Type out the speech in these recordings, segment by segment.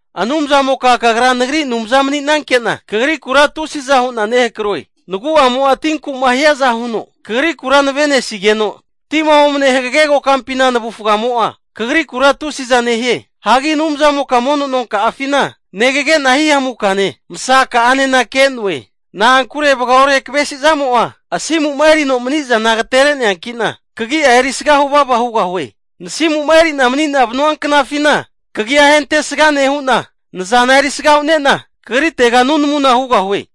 Anumzamoka Kagra nagri Anumza mani'nanke'na, Kagrikura tusiza hu'na nehakroe. Nagu'amo'a tinku'ma hiaza huno, Kagrikura navenesigeno, tima omne hagage kokampina navufgamo'a Kagrikura tusiza nehie. Hagi Anumzamoka mono nonka'afina negage'na hihamukane, masaka'anena ke'noe. Na'ankure vagaore kavesi zamo'a asimu'ma erino mani'zana agatere'neanki'na, kagi'a erisga huvava hugahue. Nasimu'ma erina mani'na vanua knafina, kagi'a ahentesga nehu'na, nazana erisga hu'nena Kagritega nunamuna hugahue.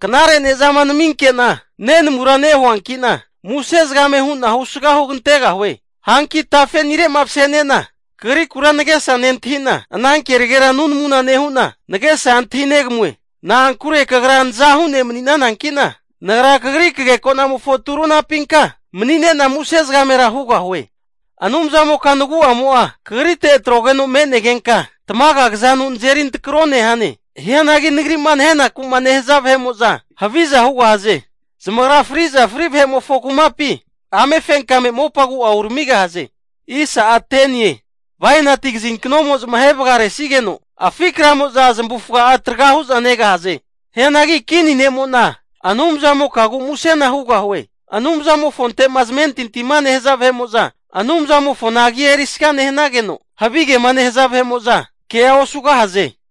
Knare ne'zama naminke'na nenamura nehuankina, muse zagame hu'na husga hugantegahue. Hanki tafenire'ma masenena, kagrikura nagesa nentahi'na, ana kenagera nunamuna nehu'na, nagesa antahigami'noe. Na'ankure Kagra nazahu ne' mani'nananki'na, nagra Kagri kagekonamofo turunapinka mani'nena muse zagamera hugahue. Anumzamoka nagu'amo'a Kagrite tragoteno me'negenka, tamaga kazanu nazeri antrako nehane. Hianagi nagri'ma nahenaku'ma nehaza vahe'mo'za haviza hugahaze. Zamagra friza fri vahe'mofo kumapi amefenkame mopa agu'a uramigahaze. Bainati kazinknonu zamahe vagaresigeno, afi kramo'za zamavufaga'a traga hu'za negahaze. Hianagi kini ne'mo'na Anumzamokagu musena hugahue. Anumzamofonte'ma zamentintima nehaza vahe'mo'za, Anumzamofona agia erisga nehanageno, havigema nehaza vahe'mo'za kea osugahaze.